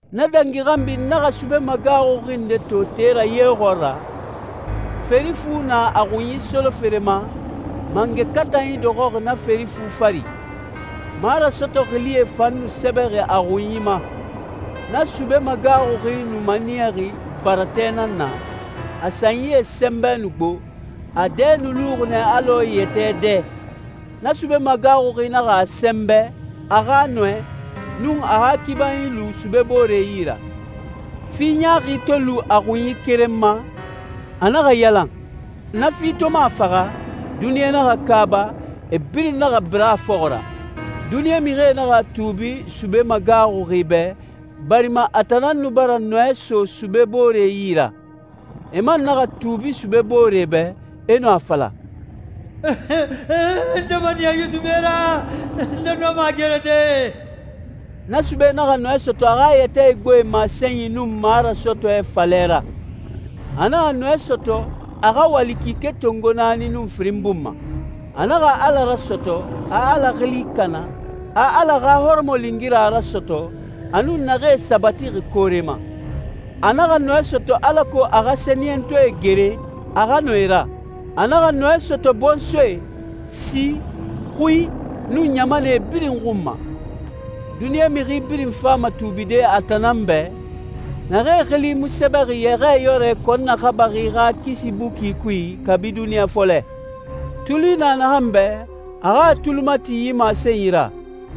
Na dangi xanbi n naxa sube magaaxuxi nde to te ra ye xɔɔra, feri fu na a xunyi solofere ma, mangɛ katanyie dɔxɔxi na feri fu fari. Marasɔtɔ xilie fan nu sɛbɛxi a xunyie ma. Na sube magaaxuxi nu maniyaxi baratɛ nan na, a sanyie sɛnbɛ nu gbo, a dɛ nu luxi nɛ alɔ yɛtɛ dɛ. Na sube magaaxuxi naxa a sɛnbɛ, a xa nɔɛ, nun a xa kibanyi lu sube boore yi ra. Fi ɲaaxi to lu a xunyi keren ma, a naxa yalan. Na fi to mu a faxa, duniɲa naxa kaaba, e birin naxa bira a fɔxɔ ra. Duniɲa mixie naxa tuubi sube magaaxuxi bɛ, barima a tan nan nu bara nɔɛ so sube boore yi ra. E man naxa tuubi sube boore bɛ, e nu a fala, «Nde maniya yi sube ra, nde nɔma a gerede?» Na sube naxa nɔɛ sɔtɔ a xa yɛtɛ igboe masenyi nun marasɔtɔɛ falɛ ra. A naxa nɔɛ sɔtɔ, a xa wali kike tongo naani nun firin bun ma. A naxa Ala rasɔtɔ, a Ala xili kana, a Ala xa hɔrɔmɔlingira rasɔtɔ, a nun naxee sabatixi koore ma. A naxa nɔɛ sɔtɔ alako a xa sɛniyɛntɔɛe gere, a xa nɔ e ra. A naxa nɔɛ sɔtɔ bɔnsɔɛ, si, xui, nun ɲamanɛ birin xun ma. Duniɲa mixi birin fama tuubide a tan nan bɛ, naxee xili mu sɛbɛxi Yɛxɛɛyɔrɛ kɔn naxabaxi xa kisi buki kui kabi duniɲa fɔlɛ. Tuli na naxan bɛ, a xa a tuli mati yi masenyi ra.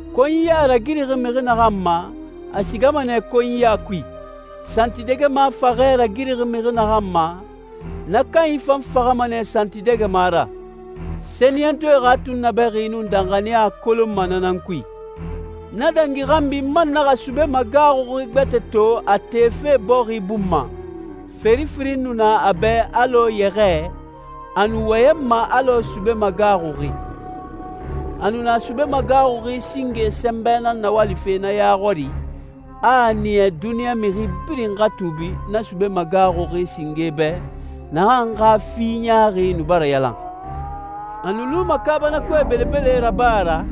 Konyiya ragirixi mixi naxan ma, a sigama nɛ konyiya kui. Santidɛgɛma faxɛ ragirixi mixi naxan ma, na kanyi fan faxama nɛ santidɛgɛma ra. Sɛniyɛntɔɛe xa tunnabɛxi nun danxaniya kolonma na nan kui. Na dangi xanbi n man naxa sube magaaxuxi gbɛtɛ to a tefe bɔxi bun ma, feri firin nu na a bɛ alɔ yɛxɛɛ, a nu wɔyɛnma alɔ sube magaaxuxi. A nu na sube magaaxuxi singe sɛnbɛ nan nawalife na ya xɔri, a a niya duniɲa mixi birin xa tuubi na sube magaaxuxi singe bɛ, naxan xa fi ɲaaxi nu bara yalan. A nu luma kaabanakoe belebele raba ra,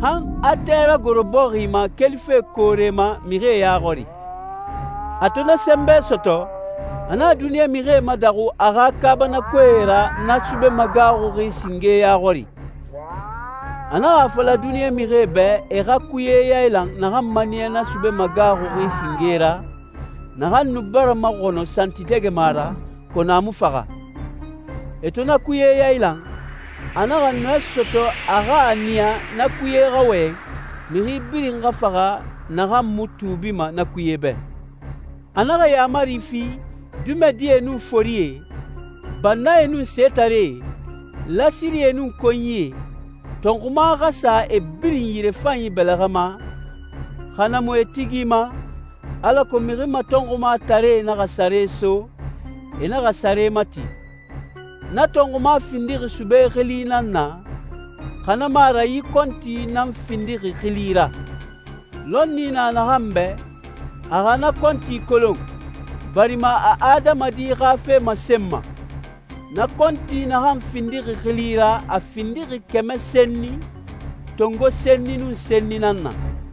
han a tɛ ragoro bɔxi ma kelife koore ma mixie ya xɔri. A to na sɛnbɛ sɔtɔ, a naxa duniɲa mixie madaxu a xa kaabanakoe ra na sube magaaxuxi singe ya xɔri. A naxa a fala duniɲa mixie bɛ e xa kuye yailan naxan maniya na sube magaaxuxi singe ra, naxan nu bara maxɔnɔ santidɛgɛma ra, kɔnɔ a mu faxa. E to na kuye yailan, a naxa nɔɛ sɔtɔ a xa a niya na kuye xa wɔyɛn, mixi birin xa faxa naxan mu tuubima na kuye bɛ. A naxa yaamari fi, dimɛdie nun forie, bannae nun setaree, lasirie nun konyie, tɔnxuma xa sa e birin yirefanyi bɛlɛxɛ ma, xa na mu e tigi ma, alako mixi matɔnxumataree naxa sare so, e naxa sare mati. Na tɔnxuma findixi sube xili nan na, xa na mu a ra yi kɔnti nan findixi xili ra. Lɔnni na naxan bɛ, a xa na kɔnti kolon, barima a adamadi xa fe masenma. Na kɔnti naxan findixi xili ra a findixi kɛmɛ senni, tongo senni nun senni nan na.